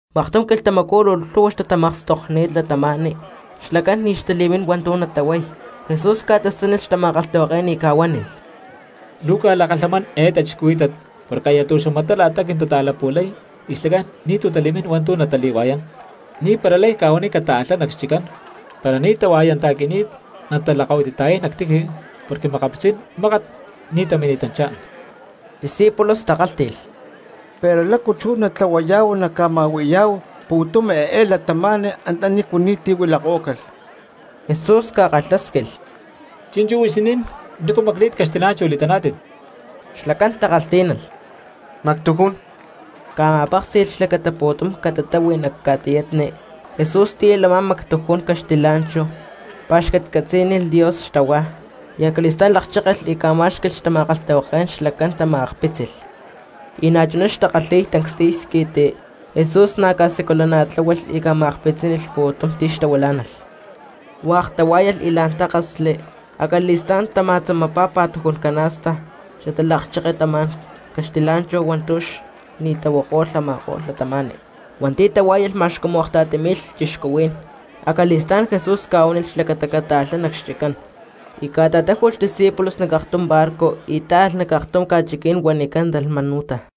Maktum quilhtamacú luu lhu̠hua xtatamakstokni̠t cristianos xlacán ni̠ xtali̠mín hua̠ntu̠ natahuay. Jesús ca̠tasánilh xtama̠kalhtahuaké̠n y ca̠huánilh: —Luu cca̠lakalhamán eé cristianos porque aya tu̠xamatá la̠ta quintata̠lapu̠lay y xlacán ni̠tu̠ tali̠mín hua̠ntu̠ natali̠hua̠yán. Ni̠para lay cca̠huaniy cataalhá nac xchiccán, para ni̠ tahua̠yanta̠qui̠ni̠t natalakahuitita̠yay nac tiji porque makapitzí̠n mákat ní tamini̠tanchá. Xdiscípulos takálhti̠lh: —Pero, ¿lácu chú natlahuayá̠hu naca̠ma̠hui̠yá̠hu pu̠tum eé cristianos antanícu ni̠ti̠ lama̠ko̠lh cristianos? Jesús ca̠kalhásquilh: —Chi̠nchú huixinín, ¿nícu macli̠t caxtilá̠nchahu li̠taná̠tit? Xlacán takalhtí̠nalh: —Mactujún. Ca̠ma̠péksi̠lh xlacata pu̠tum cristianos catatáhui nac ca̠tiyatni, Jesús tíyalh a̠má mactujún caxtilá̠nchahu, pa̠xcatcatzí̠nilh Dios xtahuá, acali̠stá̠n lakchékelh y ca̠má̠xqui̠lh xtama̠kalhtahuaké̠n, xlacán tama̠akpitzínilh pu̠tum cristianos. Y na̠chuná xtakalhi̠y tancstiy squi̠ti, Jesús na̠ ca̠siculana̠tláhualh y ca̠ma̠akpitzinícalh pu̠tum cristianos. Hua̠k tahuá̠yalh y la̠n tákasli, acali̠stá̠n tama̠tzamapá pa̠tujún cana̠sta xatalakcheketamá̠n caxtilá̠nchahu hua̠ntu̠ ni̠ tahuako̠lh a̠ma̠ko̠lh cristianos. Hua̠nti̠ tahuá̠yalh ma̠x cumu akta̠ti mi̠lh cristianos. Acali̠stá̠n Jesús ca̠huánilh xlacata cataalhá nac xchiccán. Y ca̠ta̠táju̠lh xdiscípulos nac aktum barco y táalh nac aktum ca̠chiquí̠n huanicán Dalmanuta.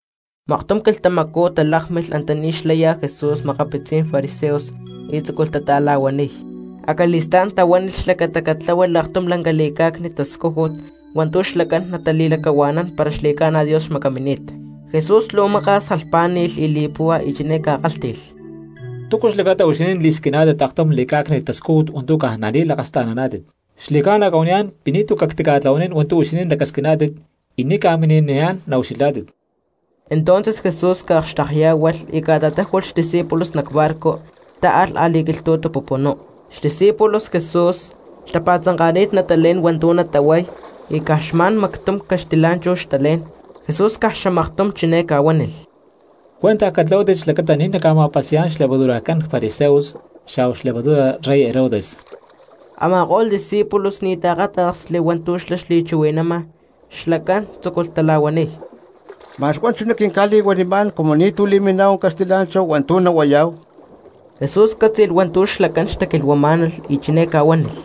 Maktum quilhtamacú talákmilh antaní xlaya Jesús makapitzi Fariseos y tzúculh tata̠la̠huaniy, acali̠stá̠n tahuánilh xlacata catláhualh aktum lanca li̠cá̠cni̠t tascújut hua̠ntu̠ xlacán natali̠lacahua̠nán para xli̠ca̠na Dios xmacamini̠t. Jesús luu maka̠s jalhpá̠ni̠lh li̠puhua y chiné ca̠kálhti̠lh: —¿Túcu xlacata huixinín li̠squiná̠tit aktum li̠cá̠cni̠t tascújut hua̠ntu̠ caj nali̠lakasta̠naná̠tit? Xli̠ca̠na cca̠huaniyá̠n pi̠ ni̠tu̠ cactica̠tlahuanín hua̠ntu̠ huixinín lacasquiná̠tit y ni̠ ca̠mini̠niyá̠n naucxilhá̠tit. Entonces Jesús ca̠akxtekyá̠hualh y ca̠ta̠táju̠lh xdiscípulos nac barco, táalh a̠li̠quilhtu̠tu pupunú. Xdiscípulos Jesús xtapa̠tzanka̠ni̠t natalé̠n hua̠ntu̠ natahuay y caj xma̠n mactum caxtilá̠nchahu xtalé̠n. Jesús caj xamaktum chiné ca̠huánilh: —Cuentaj catlahuátit xlacata ni̠ naca̠ma̠pasi̠yá̠n xlevadurajcán fariseos xa̠hua xlevadura rey Herodes. Ama̠ko̠lh discípulos ni̠ taakáta̠ksli hua̠ntu̠ xlá xli̠chuhui̠nama, xlacán tzúculh tala̠huaniy: —Ma̠x huá chuná quinca̠li̠huanimá̠n cumu ni̠tu̠ li̠miná̠hu caxtilá̠nchahu hua̠ntu̠ nahuayá̠hu. Jesús cátzi̠lh hua̠ntu̠ xlacán xtaquilhuamá̠nalh y chiné ca̠huánilh: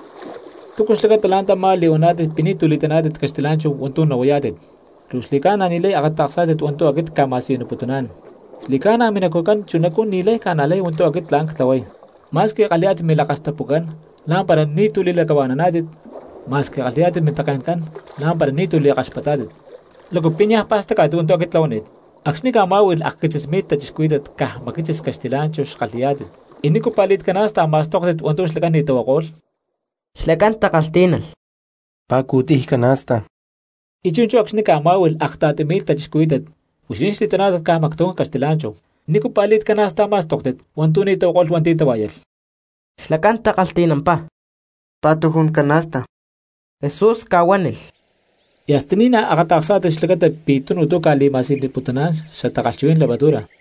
—¿Túcu xlacata la̠ntamá li̠huaná̠tit pi̠ ni̠tu̠ li̠taná̠tit caxtilá̠nchahu hua̠ntu̠ nahuayá̠tit? ¿Luu xli̠ca̠na ni̠lay akata̠ksá̠tit hua̠ntu̠ aquit cca̠ma̠siyuniputuná̠n? ¿Xli̠ca̠na minacujcán chunacú ni̠lay ca̠najlay hua̠ntu̠ aquit tla̠n cca̠tlahuay? Ma̠squi kalhi̠yá̠tit milakastapucán la̠mpara ni̠tu̠ li̠lacahua̠naná̠tit; ma̠squi kalhi̠yá̠tit mintake̠ncán la̠mpara ni̠tu̠ li̠kaxpatá̠tit. ¿Lácu pi̠ niaj pa̠stacá̠tit hua̠ntu̠ aquit ctlahuani̠t? Acxni̠ cca̠má̠hui̠lh akquitzis mi̠lh cristianos caj macquitzis caxtilá̠nchahu xkalhi̠yá̠tit ¿y nícu pa̠li̠t cana̠sta ma̠stóktit hua̠ntu̠ xlacán ni̠ tahuako̠lh? Xlacán takalhtí̠nalh: —Pa̠cu̠tiy cana̠sta. —Y chi̠nchú acxni̠ cca̠má̠hui̠lh akta̠ti mi̠lh cristianos huixinín xli̠taná̠tit caj mactujún caxtilá̠nchahu, ¿nícu pa̠li̠t cana̠sta ma̠stóktit hua̠ntu̠ ni̠ tahuako̠lh hua̠nti̠ tahuá̠yalh? Xlacán takalhti̠nampá: —Pa̠tujún cana̠sta. Jesús ca̠huánilh: —¿Y hasta ni̠naj akata̠ksá̠tit xlacata pi̠ tunu tu̠ cca̠li̠ma̠siyuniputuná̠n xatakalhchuhuí̠n levadura?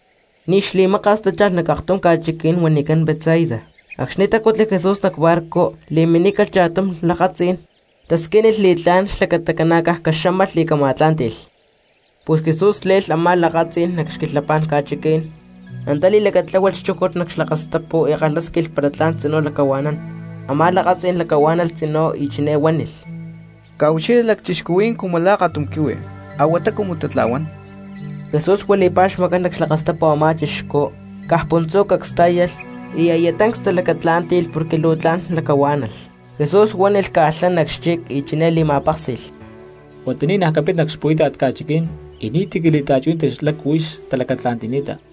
Ni̠ xli̠maka̠s tácha̠lh nac aktum ca̠chiquí̠n huanicán Betsaida; acxni̠ tacutli Jesús nac barco li̠minícalh cha̠tum lakatzí̠n tasquínilh li̠tlá̠n xlacata ca̠na̠caj caxámalh y cama̠tlá̠nti̠lh. Pus Jesús le̠lh a̠má lakatzí̠n nac xquilhapá̠n ca̠chiquí̠n, antá li̠lacatláhualh xchújut nac xlakastapu y kalhásquilh para tla̠n tzinú lacahua̠nán. Amá lakatzí̠n lacahuá̠nalh tzinú y chiné huánilh: —Cca̠ucxilha lacchixcuhuí̠n cumu la̠ akatum quihui, a̠huatá cumu tatla̠huán. Jesús huili̠pá xmacán nac xlakastapu a̠má chixcú, caj puntzú cacs tá̠yalh y aya tancs talacatlá̠nti̠lh porque luu tla̠n lacahuá̠nalh. Jesús huánilh caalhá nac xchic y chiné li̠ma̠péksi̠lh: —Huata ni̠naj capit nac xpu̠íta̠t ca̠chiquí̠n, y ni̠ti̠ cali̠ta̠chuhuí̠nanti lácu huix talacatla̠nti̠ni̠ta.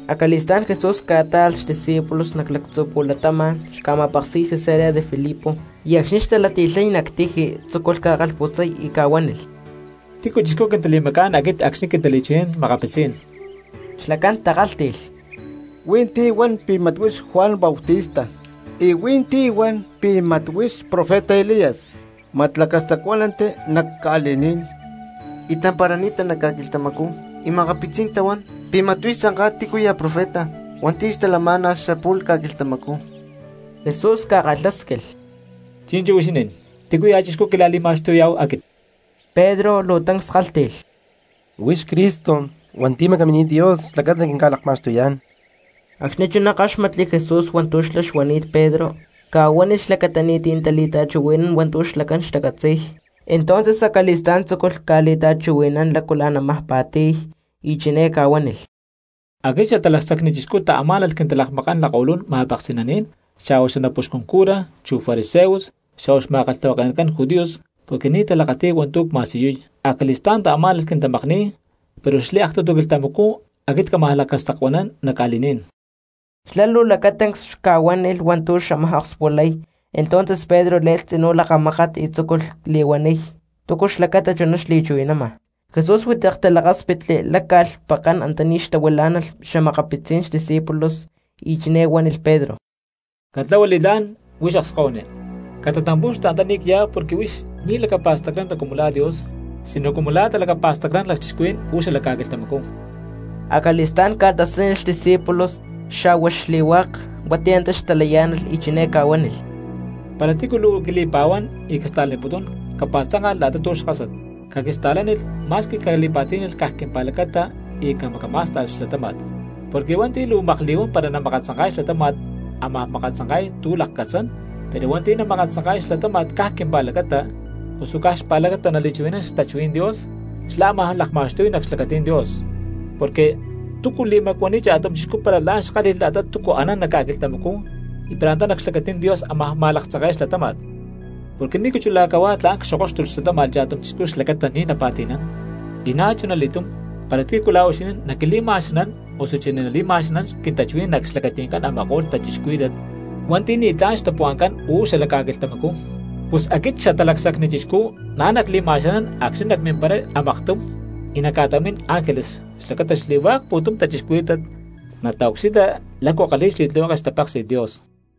Acali̠stá̠n Jesús ca̠tá̠alh xdiscípulos nac lactzu̠ pu̠latama̠n xca̠ma̠peksi̠y Cesarea de Felipo, y acxni̠ xtalati̠lhay nac tiji tzúculh ca̠kalhputzay y ca̠huánilh: —¿Tícuya̠ chixcú quintali̠macá̠n aquit acxni̠ quintali̠chuhui̠nán cristianos? Xlacán takálhti̠lh: —Hui̠nti̠ hua̠n pi̠ mat huix Juan Bautista, y hui̠ntí huan pi̠ mat huix profeta Elías mat lacastacuánanti nac ca̠li̠ní̠n y tamparani̠ta nac ca̠quilhtamacú, y makapitzí̠n cristianos tahuán pi̠ mat huix tzanká tícuya̠ profeta hua̠nti̠ xtalamá̠nalh xapu̠lh ca̠quilhtamacú. Jesús ca̠kalhásquilh: —Chi̠nchú huixinín, ¿tícuya̠ chixcú quila̠li̠ma̠xtuyá̠hu aquit? Pedro luu tancs kálhti̠lh: —Huix Cristo hua̠nti̠ macaminít Dios xlacata naquinca̠lakma̠xtuyá̠n. Acxni̠ chuná káxmatli Jesús hua̠ntu̠ xlá xuanini̠t Pedro, ca̠huánilh xlacata ni̠ti̠ natali̠ta̠chuhui̠nán hua̠ntu̠ xlacán xtacatzi̠y. Entonces acali̠stá̠n tzúculh ca̠li̠ta̠chuhui̠nán lácu la̠n ámaj pa̠ti̠y y chiné ca̠huánilh: —Aquit Xatalacsacni Chixcú taamá̠nalh quintalakmakán lakko̠lún ma̠peksi̠naní̠n xa̠hua xanapuxcun cura, chu fariseos, xa̠hua xma̠kalhtahuake̠nacán judíos porque ni̠ talakati̠y hua̠ntu̠ cma̠siyuy. Acali̠stá̠n taamá̠nalh quintamakni̠y, pero xliaktutu quilhtamacú aquit cámaj lacastacuanán nac ca̠li̠ní̠n. Xlá luu lacatancs ca̠huánilh hua̠ntu̠ xamaj okspulay; entonces Pedro le̠lh tzinú lakamákat y tzúculh li̠huaniy túcu xlacata chuná xli̠chuhui̠nama. Jesús huitek talákspitli, láca̠lh pekán antaní xtahuilá̠nalh xa̠makapitzí̠n xdiscípulos y chiné huánilh Pedro: —Catlahua li̠tlá̠n, huix akskahuiní, catatampu̠xtu antaní cyá porque huix ni̠ lacapa̠stacnana cumu la̠ Dios sino cumu la̠ talacapa̠stacnán lacchixcuhuí̠n uú xalac ca̠quilhtamacú. Acali̠stá̠n ca̠tasánilh xdiscípulos xa̠hua xli̠hua̠k cristianos hua̠nti̠ antá xtalayá̠nalh y chiné ca̠huánilh: —Para tícu luu quili̠pa̠huán y quista̠laniputún capa̠tzánka̠lh la̠ta tu̠ xkásat, caquista̠lánilh ma̠squi cali̠pa̠tí̠nalh caj quimpa̠lacata y camacamá̠sta̠lh xlatáma̠t. Porque hua̠nti̠ luu makli̠huán para namakatzanka̠y xlatáma̠t ámaj makatzanka̠y tu̠ lakcatzán, pero hua̠nti̠ nama̠laktzanke̠y xlatáma̠t caj quimpa̠lacata, osu caj xpa̠lacata nali̠chuhui̠nán xtachuhuí̠n Dios, xlá ámaj lakma̠xtuy nac xlacatí̠n Dios. Porque, ¿túcu li̠macuaniy cha̠tum chixcú para la̠n xkálhi̠lh la̠ta túcu anán nac ca̠quilhtamacú y para antá nac xlacatí̠n Dios ámaj ma̠laktzanke̠y xlatáma̠t? Porque, ¿nícu chulá cahuá tla̠n cxokóxtulh xlatáma̠t cha̠tum chixcú xlacata ní napa̠ti̠nán? Y na̠chuna li̠túm para tícu la̠ huixinín naquili̠ma̠xanán osuchí nali̠ma̠xanán quintachuhuí̠n nac xlacati̠ncán a̠ma̠ko̠lh cristianos hua̠nti̠ ni̠tlá̠n xtapuhua̠ncán uú xalac ca̠quilhtamacú, pus aquit Xatalacsacni Chixcú na̠ nacli̠ma̠xanán acxni̠ nacmimparay a̠maktum y nacca̠ta̠mín ángeles xlacata xli̠hua̠k pu̠tum cristianos nataucxilha lácu kalhi̠y xli̠tlihueke xtapéksi̠t Dios.